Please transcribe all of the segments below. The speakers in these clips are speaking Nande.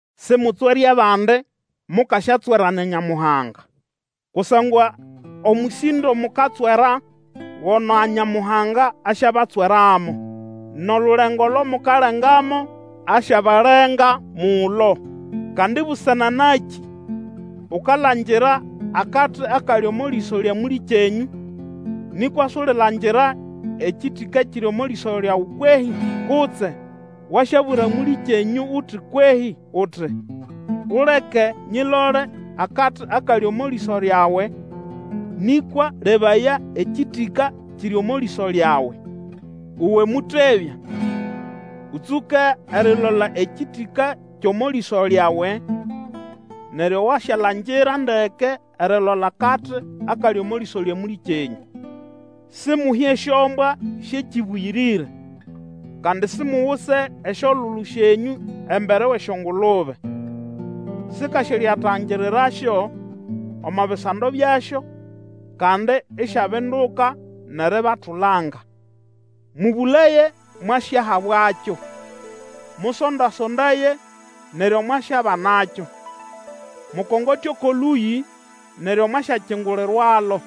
Simutswere abandi, mukasyatswerwa na Nyamuhanga. Kusangwa omũsĩndo mukatswera, gona Nyamuhanga asyabatsweramo; nʼolulengo olo mukalengamo, asyabalenga mulo. Kandi busana nakĩ ukalangira akati akali omo lĩso lya mũlĩkenyũ, nĩkwa sulilangira ekĩtĩka ekiri omo lĩso lyawe kwehĩ? Kutse wasyabwira mũlĩkyenyũ uti kwehĩ, uti, Uleke nyilole akati akali omo lĩso lyawe, nĩkwa lebaya, ekĩtĩka kiri omo lĩso lyawe. Uwe mũtebya! Ũtsũke erilola ekĩtĩka kyʼomo lĩso lyawe, neryo wasyalangira ndeke erilola akati akali omo lĩso lya mũlĩkyenyũ. Simuhe esyombwa syʼekĩbũyĩrĩre, kandi simuguse esyolulu syenyũ embere wʼesyongulube, sikasyalyatangirirasyo omo bisando byasyo, kandi isyabinduka nʼeribatulanga. Mũbũlaye, mwasyahabwakyo; musonda-sondaye, neryo mwasyabanakyo; mukongote oko lũyĩ, neryo mwasyakingulirwalo.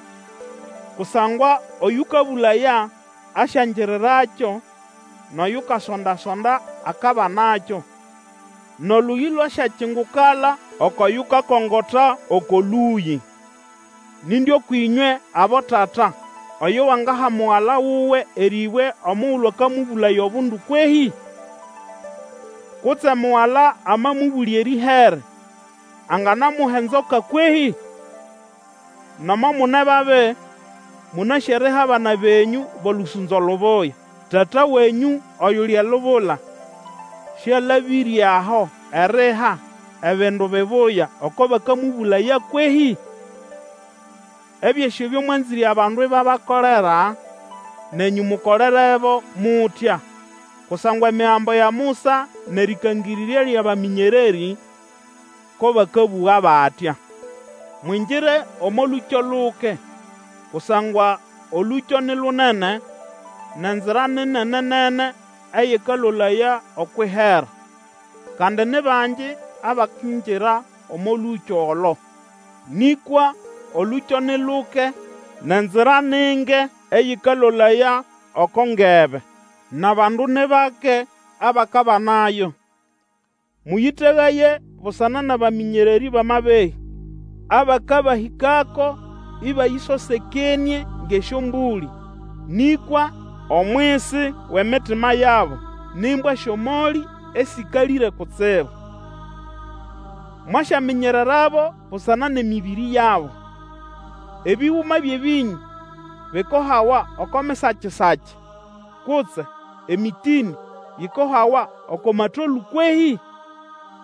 Kusangwa oyũkabũlaya, asyangirirakyo; nʼoyukasonda-sonda, akabanakyo; nʼolũyĩ lwasyakingukala oko yukakongota oko lũyĩ. Nindi ũkwʼĩnywe abotata oyo wangaha mugala wuwe erĩbwe omugulu akamũbũlaya obundu kwehĩ? Kutse mugala amamũbũlya erĩhere, anganamuha enzoka kwehĩ? Nomo mune babi, mũnasĩ eriha abana benyũ bʼolũsũnzo lubuya. Tata wenyũ oyuli elubula sĩalabĩre aho eriha ebindu bibuya oko bakamũbũlaya kwehĩ? Ebyosĩ ebyo mwanzĩre abandu ibabakolera, nenyũ mukolerebo mutya; kusangwa Emigambo ya Musa nʼerĩkangĩrĩrya lyʼabamĩnyererĩ ko bakabũga batya. Mwingire omo lũkyo luke; kusangwa olũkyo ni lunene, nʼenzira ni nenenene eyĩkalolaya okwʼihera, kandi ni bangi abakingira omo lũkyo olo. Nĩkwa olũkyo ni luke, nʼenzira ni nge eyĩkalolaya oko ngebe, nʼabandu ni bake abakabanayo. Mũyĩtegaye busana nʼabamĩnyererĩ bʼamabehĩ, abakabahĩkako ĩbayĩsosekenĩe ngʼesyombũlĩ, nĩkwa omwisi wʼemitima yabo ni mbwa syʼomolĩ esĩkalĩre kutsibu. Mwasyaminyererabo busana nʼemĩbĩrĩ yabo. Ebĩgũma byʼebĩnyũ bikohawa oko misakisaki, kutse emĩtĩnĩ yikohawa oko matolũ kwehĩ?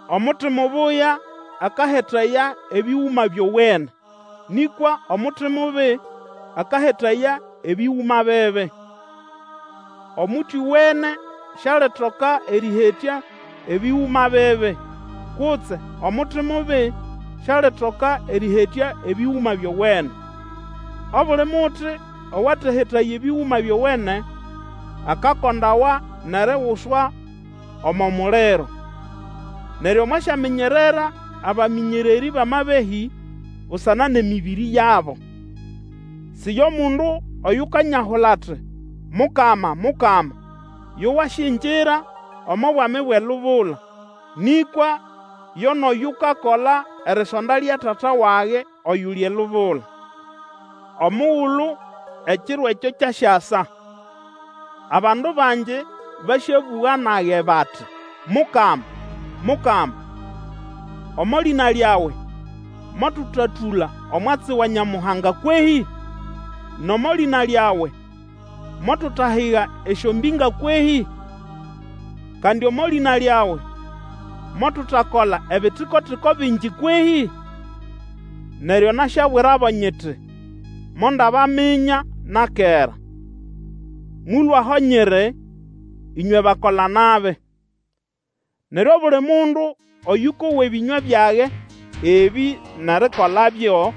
Omuti mubuya akahetaya ebĩgũma byowene, nĩkwa omuti mubi akahetaya ebĩgũma bibi. Omuti owene sialitoka erĩhetya ebĩgũma bibi, kutse omuti mubi sialitoka erĩhetya ebĩgũma byowene. Obuli muti owatehetaya ebĩgũma byowene akakondawa nʼeriguswa omo muliro. Neryo mwasyaminyerera abamĩnyererĩ bʼamabehĩ busana nʼemĩbĩrĩ yabo. Si yo mundu oyukanyahula ati, Mukama, Mukama, yo wasyingira omo Bwami bwʼelubula; nĩkwa yo nʼoyukakola erisonda lya Tata wage oyuli elubula. Omugulu ekiro ekyo kyasyasa, abandu bangi basyabũga nage bati, Mukama, Mukama! Omo lĩna lyawe motũtatũla omwatsi wa Nyamuhanga kwehĩ? Nʼomo lĩna lyawe motutahiga esyombĩnga kwehĩ? Kandi omo lĩna lyawe motutakola ebitiko-tiko bingi kwehĩ? Neryo nasyabwirabo nyiti, Mondabaminya na kera. Mũlũe aho nyiri, ĩnywe bakola-nabi. Neryo, obuli mundu oyũkowa ebĩnywa byage ebĩ nʼerikolabyo,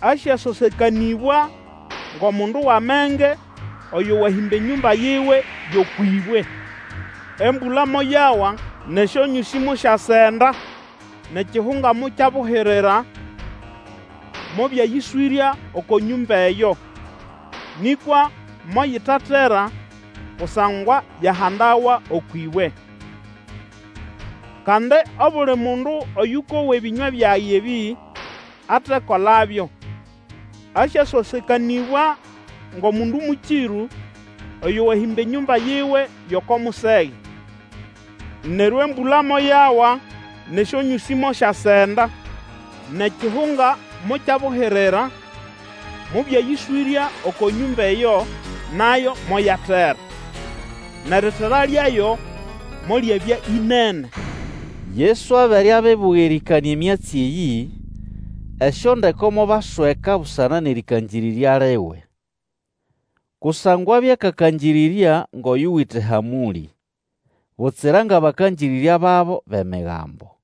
asyasosekanĩbwa ngʼomundu wʼamenge, oyo wahĩmba enyũmba yiwe yʼokwʼĩbwe. Embũla moyawa, nʼesyonyũsĩ mosyasenda, nʼekihunga mokyabuhirira, mobyayĩswĩrya oko nyũmba eyo. Nĩkwa moyitatera, kusangwa yahandawa okwʼĩbwe. Kandi obuli mundu oyũkowa ebĩnywa byage ebĩ atekolabyo, asyasosekanĩbwa ngʼomundu mũkĩrũ, oyo wahĩmba enyũmba yiwe yʼoko musege. Neryo embũla moyawa, nʼesyonyũsĩ mosyasenda, nʼekihunga mokyabuhirira, mobyayĩswĩrya oko nyũmba eyo, nayo moyatera. Nʼeritera lyayo molyabya ĩnene. Yesu abere abibuga erĩkanĩa emyatsi eyĩ, esyondeko mobasweka busana nʼerĩkangĩrĩrya liwe. Kusangwa abya akakangĩrĩrya ngʼoyuwite hamũlĩ, butsira ngʼabakangĩrĩrya babo bʼemigambo.